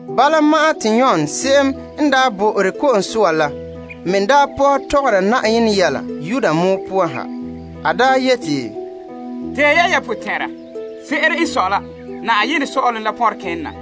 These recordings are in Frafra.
Bala ma'an te Yon Ko'sɔɔra la mɛ daa pɔhɛ mɔɔla Yudea pɔgɔtia poan ha. A daa yeti, Tee ya ya potɛn'ɛra. Se'ere n sɔe la saazuo sɔ'ɔlom pɔnre kene na.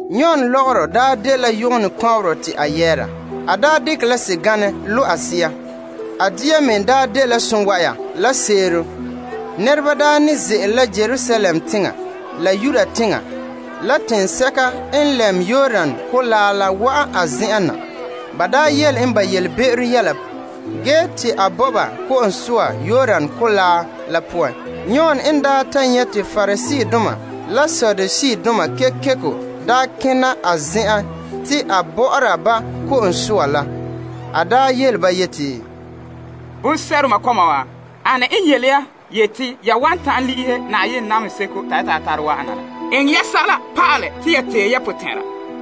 Yon lɔgɔrɔ daa dela yɔgɔnɛ kɔnberɔ te a yɛɛra. A dekɛ la sɛganɛ lo' a sea. A dia me dela sonwa'ara la seerom. Nɛreba daa ne ze'ele Yerusalem teŋa la Yudea teŋa la teŋsɛka n lɛm Yordan Kolaa la wa'an a zen'en na, puta ba yelebe'ero, ge te a bɔ'ɔra ba ko'om soa Yordan Kolaa la poan. Yon n daa ta nyɛ' te Pariseedoma la Saduseedoma kekeko kena a zen'en te a bɔ'ɔra ba ko'om soa la, a yele ba yeti, Bonsɛ'doma kɔma wa, ane n yele ya te ya wan ta'an le'ehɛ namehe seko te Na'ayenɛ yeti a bahɛ te la wa'ana la? Eŋɛ ya sɛla pa'alɛ te ya tee ya potɛn'ɛra,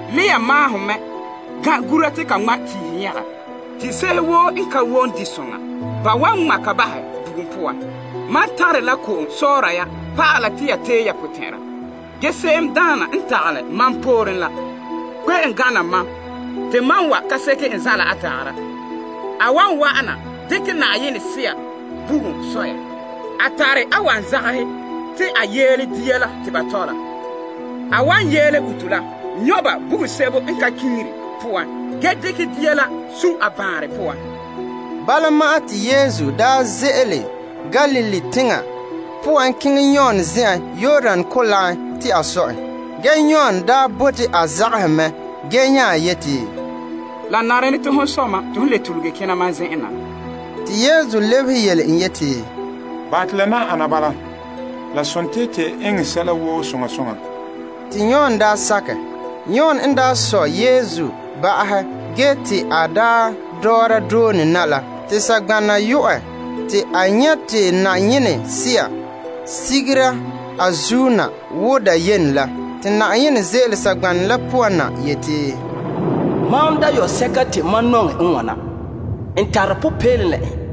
Lea maahom mɛ gan' gura te ka ŋma' tiihe nyɛga. Tiihe se'ehe woo n ka wom di soŋa, ba wan ŋma' ka bahɛ bugum poan. Mam tare la ko'om sɔɔra ya pa'ala ta ya tee ya potɛn'ɛra. Ge se'emdaana n tagalɛ mam pooren la kpe'em gana mam, te mam ka seke n zanla a tagara. A wan wa'ana dekɛ Na'ayenɛ Sea la bugum sɔ ya. A tare a wanzagahe te a yeele dia la te ba tɔ la. A wan yeele uto la nyɔ' ba bugum sebo n ka kiŋire poan ge dekɛ dia la sun' a baanrɛ poan. Bala ma'an te Yesu daa ze'ele Galilee teŋa poan keŋɛ Yon zen'en Yordan Kolaa poan, te a sɔ en. Ge Yon daa bote a zagahɛ mɛ ge nya yeti, La nare ne te hon sɔ mam te hon le tuluge kena mam zen'en na? Te Yesu lebehe yele en yeti, Bahɛ te la nan ana bala. La sontii te eŋɛ sɛla woo soŋa soŋa. Te Yon daa sakɛ. Yon n sɔ Yesu ba'ahɛ te a dɔɔra doone na la, te saŋgbanɛ yo'ɛ te a nyɛ' te Yenɛ Sea sigera a zuo na, wo dayene la. Te koŋkore ze'ele saŋgbanɛ la poan na yeti, Mam dayɔba'arɛ te mam nintegɛ. N tare popeelom la en.